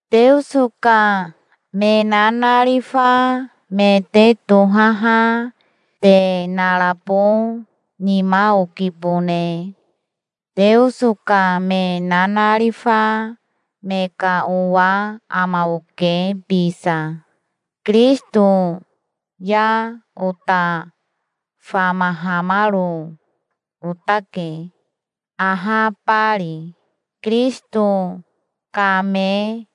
Teoso ka me nanarifa me te tohaha te narabo nima okibone. Teoso ka me nanarifa me ka owa ama oke bisa. Kirisito ya ota famahamaro otake, ahabari. Kirisito kame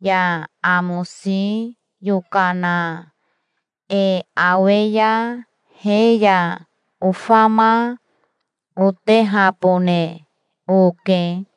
ya amosi yokana e awe ya he ya ofama otehabone oke.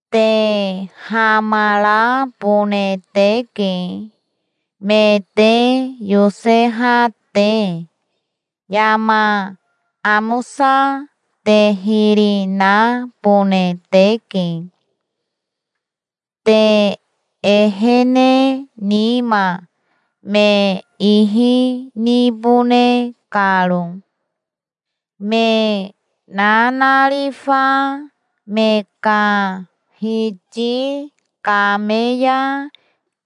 Te hamarabone teke, me te yoseha te. Yama amosa te hiri nabone teke, te ehene nima me ihi nibone karo. Me nanarifa me ka Hiti kame ya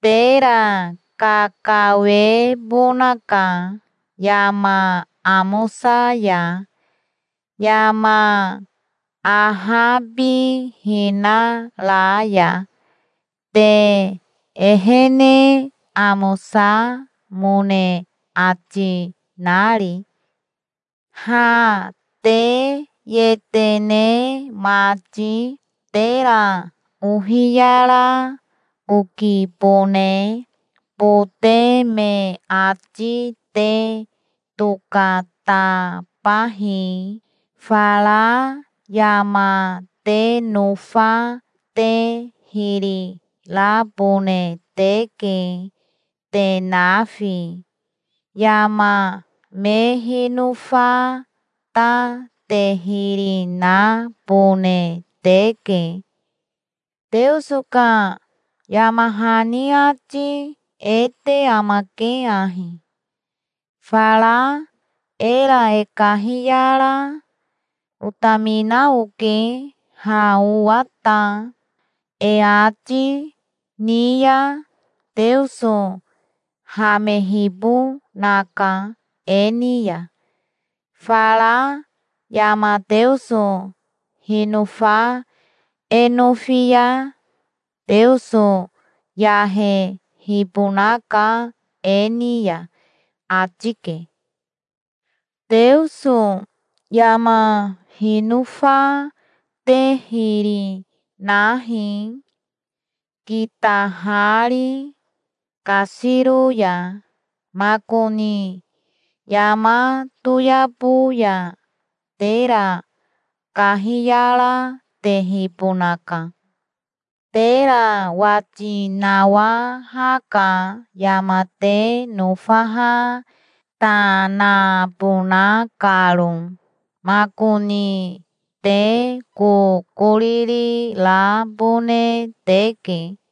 tera kakawebonaka yama amosa ya, yama ahabihina ra ya, te ehene amosamone ati nari. Ha te yetene mati tera ohiyara okibone. Bote me ati te tokatabahi. Fara yama te nofa te hiri rabone teke, te nafi. Yama me hinofa ta te hiri nabone teke. Teoso ka yama hani ati e te amake ahi: "Fara era e kahiyara, 'Otamina oke ha owa ta', e ati ni ya Teoso hamehibonaka e ni ya. Fara yama Teoso hinofa e nofi ya Teoso yahehibonaka e ni ya", ati ke. Teoso yama hinofa te hiri nahi, kitahari kasiro ya. Makoni yama toyabo ya tera kahiyaratehibonaka. Tera wati nawahaka, yama te nofaha ta nabona karo. Makoni te kokoriri rabone teke.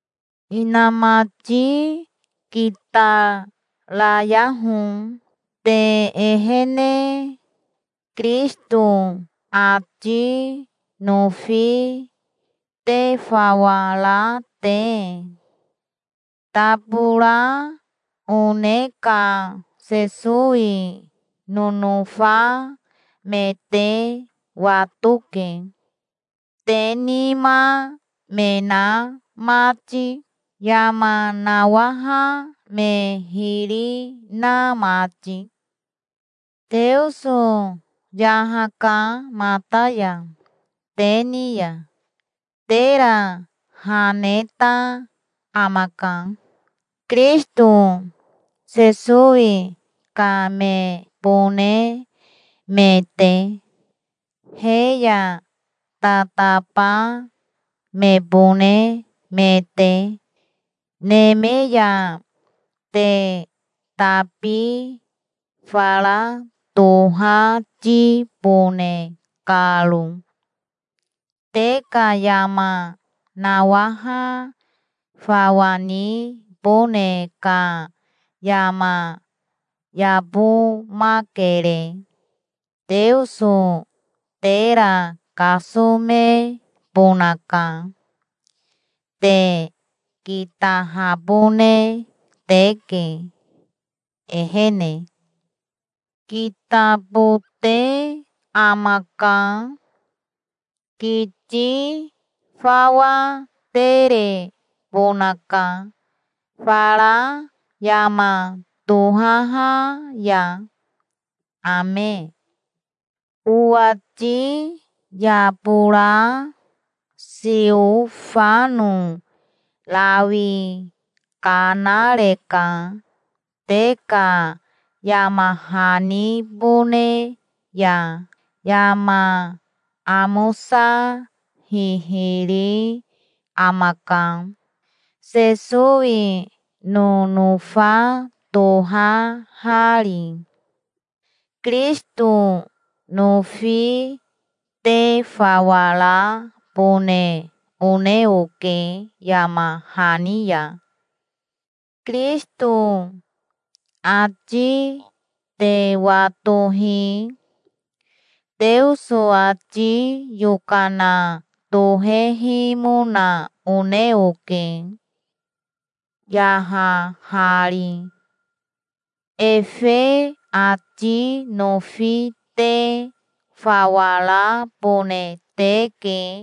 Inamati kitarayaho te ehene, Kirisito ati nofi te fawa ra te. Tabora one ka Sesowi nonofa me te watoke, te nima me na mati, yama nawaha me hiri na mati. Teoso yahaka mata ya te ni ya. Tera ha neta amaka, Kirisito Sesowi ka mebone me te, he ya tataba mebone me te, neme ya, te tabi fara tohatibone karo. Te ka yama nawaha fawa nibone ka yama yabomakere. Teoso tera kasomebonaka. Te kitahabone teke, ehene. Kitabote amaka. Kiti fawa terebonaka fara yama tohaha ya. Ame. Owati yabora Siofano rawi kanareka te ka yama hanibone ya. Yama amosa hihiri amaka, Sesowi nonofa tohahari. Kirisito nofi te fawa rabone one oke yama hani ya. Kirisito ati te watohi Teoso ati yokana tohehimona one oke, yahahari. Efe ati nofi te fawa rabone teke